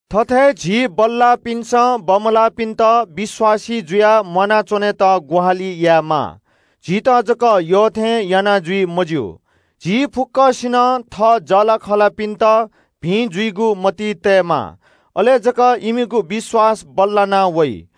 थथे झी बल्‍लाःपिन्‍सं बमलाःपिन्‍त विश्‍वासी जुयाः म्‍वानाच्‍वनेत ग्‍वाहालि यायेमाः, झीत जक यःथें याना जुइ मज्‍यू। झी फुक्‍कसिनं थः जःलाखःलापिन्‍त भिं जुइगु मतिइ तयेमाः, अले जक इमिगु विश्‍वास बल्‍लानावइ।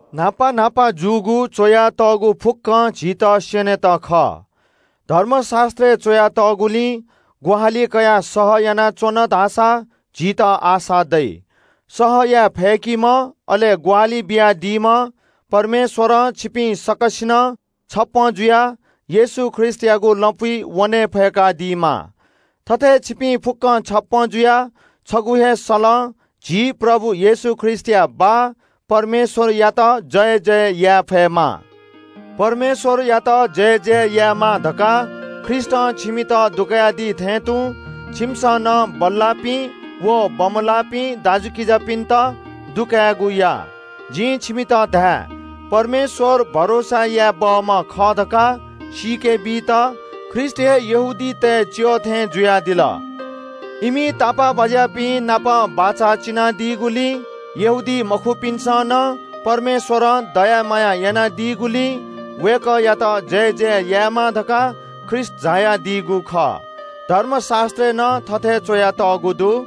न्‍हापा न्‍हापा जूगु च्‍वयातःगु फुक्‍क खँ झीत स्‍यनेत खः। धर्मशास्‍त्रय् च्‍वयातःगुपाखें ग्‍वाहालि कयाः सह यानाच्‍वन धाःसा झीत आशा दइ। सह याये फय्‌कादीम्‍ह अले ग्‍वाहालि बियादीम्‍ह परमेश्‍वरं छिपिं सकसिनं छप्‍पँ जुयाः येशू ख्रीष्‍टयागु लँपुइ वने फय्‌कादीमा। थथे छिपिं फुक्‍कं छप्‍पँ जुयाः छगू हे सलं झी प्रभु येशू ख्रीष्‍टया बाः परमेश्‍वरयात जयजय याये फयेमा। परमेश्‍वरयात जयजय यायेमा धकाः ख्रीष्‍टं छिमित नालादी थें तुं छिमिसं नं बल्‍लाःपिं व बमलाःपिं दाजुकिजापिन्‍त नाला कायेगु या। जिं छिमित धाये – परमेश्‍वर भरोसा याये बहःम्‍ह खः धकाः सीके बीत ख्रीष्‍ट हे यहूदीतय् च्‍यः थें जुयादिल। इमि तापाःबाज्‍यापिन्‍त बचं बियादीगुलिं यहूदीमखुपिन्‍सं नं परमेश्‍वरं दया माया यानादीगुलिं वय्‌कःयात जयजय यायेमा धकाः ख्रीष्‍ट झायादीगु खः। धर्मशास्‍त्रय् नं थथे च्‍वयातःगु दु –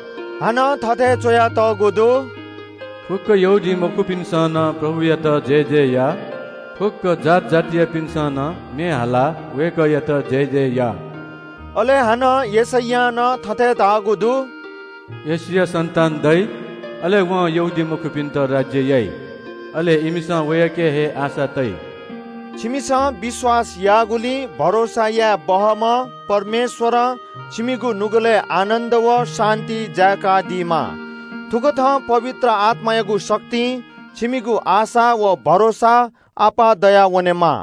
हानं थथे च्‍वयातःगु दु – फुक्‍क यहूदीमखुपिन्‍सं नं प्रभुयात जयजय या। फुक्‍क जात जातियापिन्‍सं नं म्‍ये हालाः वय्‌कःया प्रशंसा या! अले यशैयां नं थथे धाःगु दु – “यिशैया सन्‍तान दइ, वं यहूदीमखुपिन्‍त राज्‍य याइ। अले इमिसं वय्‌कःयाके हे आशा तइ।” छिमिसं विश्‍वास याःगुलिं भरोसा याये बहःम्‍ह परमेश्‍वरं छिमिगु नुगलय् आनन्‍द व शान्‍ति जाय्‌कादीमा। थुकथं पवित्र आत्‍मायागु शक्तिं छिमिगु आशा व भरोसा अप्‍वः दयावनेमा।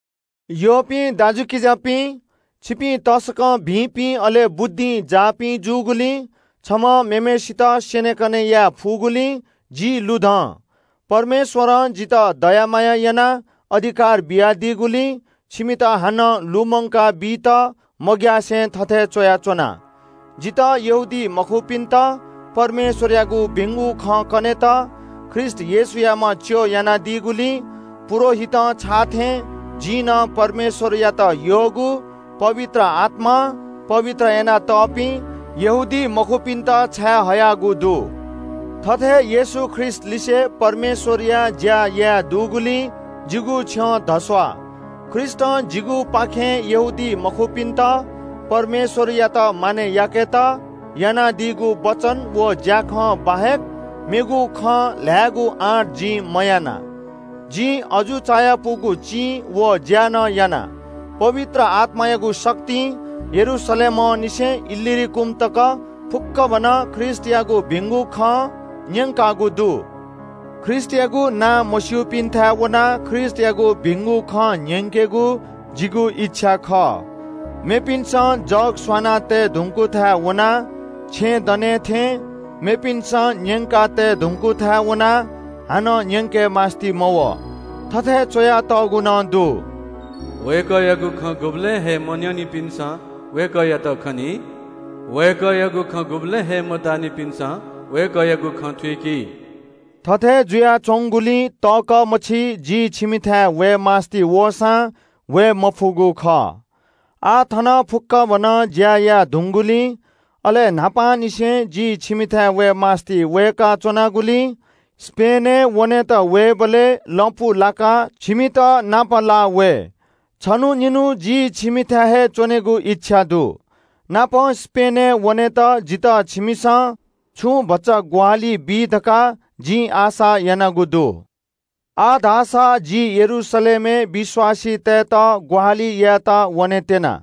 यःपिं दाजुकिजापिं, छिपिं तसकं भिंपिं अले बुद्धिं जाःपिं जूगुलिं छम्‍हं मेम्‍हय्‌सित स्‍यनेकने याये फुगुलिं जि लुधं। परमेश्‍वरं जितः दया माया यानाः अधिकार बियादीगुलिं छिमित हानं छुं मू खँ लुमंकाबीत मग्‍यासे थथे च्‍वयाच्‍वना। जितः यहूदीमखुपिन्‍त परमेश्‍वरयागु भिंगु खँ कनेत ख्रीष्‍ट येशूयाम्‍ह च्‍यः यानादीगुलिं पुजाहारीं छाःथें जिं नं परमेश्‍वरयात यःगु पवित्र आत्‍मां शुद्ध यानातःपिं यहूदीमखुपिन्‍त छाये हयागु दु। थथे येशू ख्रीष्‍टलिसे परमेश्‍वरया ज्‍या याये दुगुलिं जिगु छ्यं धस्‍वाः। ख्रीष्‍टं जिगुपाखें यहूदीमखुपिन्‍त परमेश्‍वरयात मानय् याकेत यानादीगु वचन व ज्‍याखँ बाहेक मेगु खँ ल्‍हायेगु आँट जिं मयाना। जिं अजू चायापुगु चिं व ज्‍या नं याना, पवित्र आत्‍मायागु शक्तिं यरूशलेमंनिसें इल्‍लुरिकन तक फुक्‍कभनं ख्रीष्‍टयागु भिंगु खँ न्‍यंकागु दु। ख्रीष्‍टयागु नां मस्‍यूपिन्‍थाय् वनाः ख्रीष्‍टयागु भिंगु खँ न्‍यंकेगु जिगु इच्‍छा खः। मेपिन्‍सं जग स्‍वना तये धुंकूथाय् वनाः छेँ दनेथें मेपिन्‍सं न्‍यंका तये धुंकूथाय् वनाः हानं न्‍यंके मास्‍ति मवः। थथे च्‍वयातःगु नं दु – “वय्‌कःयागु खँ गुबलें हे मन्‍यनिपिन्‍सं वय्‌कःयात खनी। वय्‌कःयागु खँ गुबलें हे मताःनिपिन्‍सं वय्‌कःयागु खँ थुइकी।” थथे जुयाच्‍वंगुलिं तःकः मछि जि छिमिथाय् वये मास्‍ति वःसां वये मफुगु खः। आः थन फुक्‍कभनं ज्‍या याये धुंगूलिं, अले यक्‍व दँ न्‍ह्यवंनिसें जि छिमिथाय् वये मास्‍ति वय्‌का च्‍वनागुलिं स्‍पेनय् वनेत वयेबलय् लँपु लाकाः छिमित नापलाः वये। छन्‍हु निन्‍हु जि छिमिथाय् हे च्‍वनेगु इच्‍छा दु, नापं स्‍पेनय् वनेत जितः छिमिसं छुं भचा ग्‍वाहालि बी धकाः जिं आशा यानागु दु। आः धाःसा जि यरूशलेमय् विश्‍वासीतय्‌त ग्‍वाहालि यायेत वनेत्‍यना।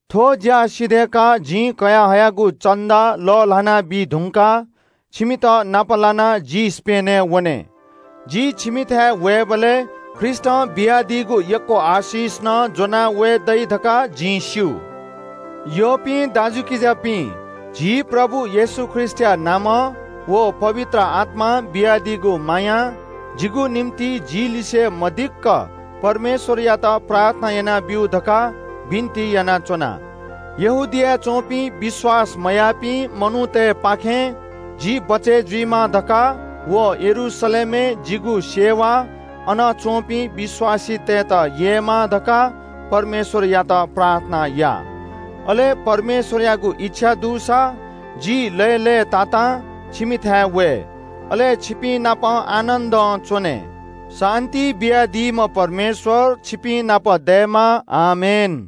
थ्‍व ज्‍या सिधय्‌काः जिं कयाः हयागु भेटी लःल्‍हाना बीधुंकाः छिमित नाप लानाः जि स्‍पेनय् वने। जि छिमिथाय् वयेबलय् ख्रीष्‍टं बियादीगु यक्‍व आशिष नं ज्‍वनाः वये दइ धकाः जिं स्‍यू। यःपिं दाजुकिजापिं, झी प्रभु येशू ख्रीष्‍टया नामं व पवित्र आत्‍मां बियादीगु मायां जिगु निंतिं जिलिसें मदिक्‍क परमेश्‍वरयात प्रार्थना यानाब्‍यु धकाः बिन्‍ति यानाच्‍वना। यहूदियाय् च्‍वंपिं विश्‍वास मयाःपिं मनूतय्‌पाखें जि बचय् जुइमा धकाः व यरूशलेमय् जिगु सेवा अन च्‍वंपिं विश्‍वासीतय्‌त ययेमा धकाः परमेश्‍वरयात प्रार्थना या। अले परमेश्‍वरयागु इच्‍छा दुसा जि लय्‌लय्‌तातां छिमिथाय् वये, अले छिपिंनाप आनन्‍दं च्‍वने। शान्‍ति बियादीम्‍ह परमेश्‍वर छिपिंनाप दयेमा। आमेन।